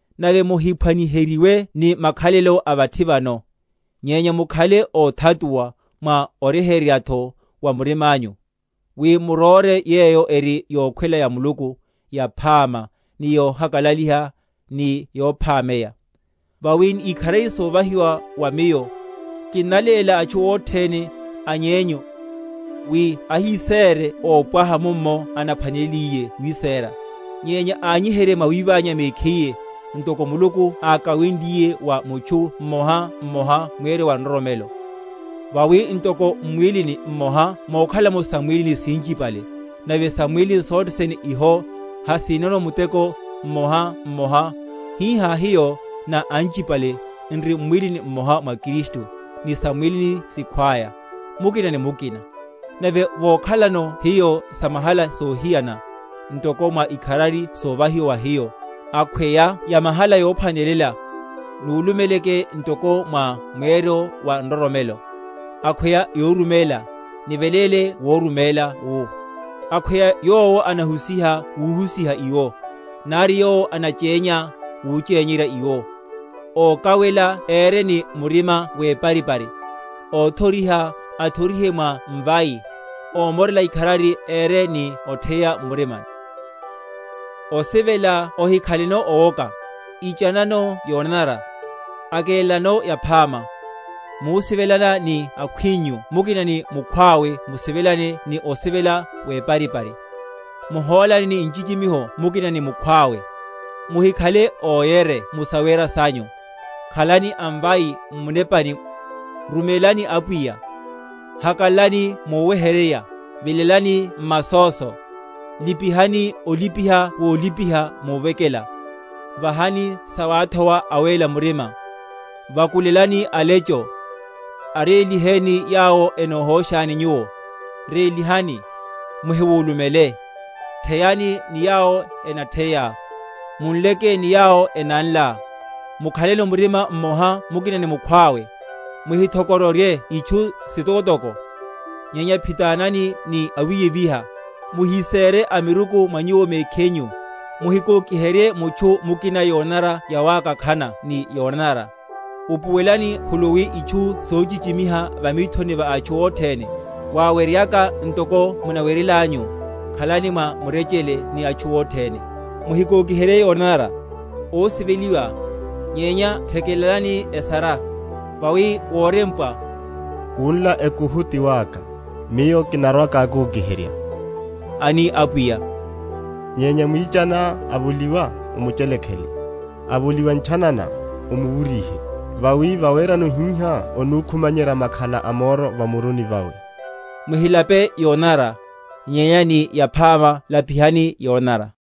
Nave muhiphwaniheryiwe ni makhalelo a vathi vano: nyenya mukhale óthatuwa, mwa oryeheryatho wa murimanyu, wi muróre yeyo eri yokhwela ya Muluku, yaphama, ni yohakalaliha, ni yophámeya. Vawi ni ikharari sovahiwa wa miyo, kinnaléla atchu othene a nyenyu, wi ahisére ópwaha mummo anaphwaneleliye wiséra; nyenya anyiherye mwawiványa mekhiye, ntoko Muluku ákawenliye wa mutchu mmoha mmoha mweryo wa nroromelo. Vawi ntoko m’mwílini mmoha mokhala’mo sam’mwílini sinchipale, nave sam’mwílini sothene iho hasinono muteko mmohamoha; hihá hiyo, na anchiene, n’ri mwíli mmoha wa Kristu, ni sam’mwílini sikhwaya, mukina ni mukina. Nave vokhalano hiyo samahala sohiyana, ntoko mwa ikharari sovahiwa wa hiyo, akhweya yamahala yophwanelela, nulumeleleke ntoko mwa mweryo wa nroromelo; akhweya yoruméla, niveléle wuruméla wu; akhweya yowo anahusiha wuhusiha iwo; nari yowo anachénya, wuchenyerya iwo; ókawela ére ni murima weparipari; óthoriha, athorihe mwa mvai; ómorela ikharari, ére ni otheya m’murima. Osivela, wiroha, ikharari. Osivela ohikhaleno owoka. Ichanano yonanara; akélelanano yaphama. Musivelana ni akhwinyu mukina ni mukhwawe musivelane ni osivela weparipari; muhólane ni ochichimihana mukina ni mukhwawe; muhikhale óyere mu sawera sanyu; khalani amvai m’munepani, rumélani Apwiya; hakalalani muweheryerya; vilelani m’masóso, lipihani olipiha wolipiha muvekela. Vahani sawathowa awéla murima; vakulelakani alecho. Aréliheni yawo enohóshani nyuwo; rélihani, muhiwulumele. Theyani ni yawo enatheya; munleke ni yawo enanla. Mukhaleno murima mmoha mukina ni mukhwawe. Muhitho?-?kororye itchu sitokotoko, nyenya phitananani ni awiyeviha. Muhisere amiruku mwa nyuwo mekhinyu. Muhimukokiherye mutchu mukina yonanara yawakak?-?hana ni yonanara. Upuwelelani khuluwi itchu sochichimiha va mithoni va atchu othene. Waweryeyaka, ntoko munaweryelanyu, khalani mwa murechele ni atchu othene. Muhikokiherye yonanara, ósiveliwa, nyenya thekelani esara; vawi worempwa, Wunla ekuhu ti waka, Miyo kinarwa‐kikokiherya, ani Apwiya. Nyenya mwichaniá avoliwa, omuchelekhele, avoliwa ntchanana, omuwuryihe; vawi vawerano hihá onukumanyerya makhala a moro va muruni vawe. Muhilape yonanara, nyenya ni yaphama lapihani yonanara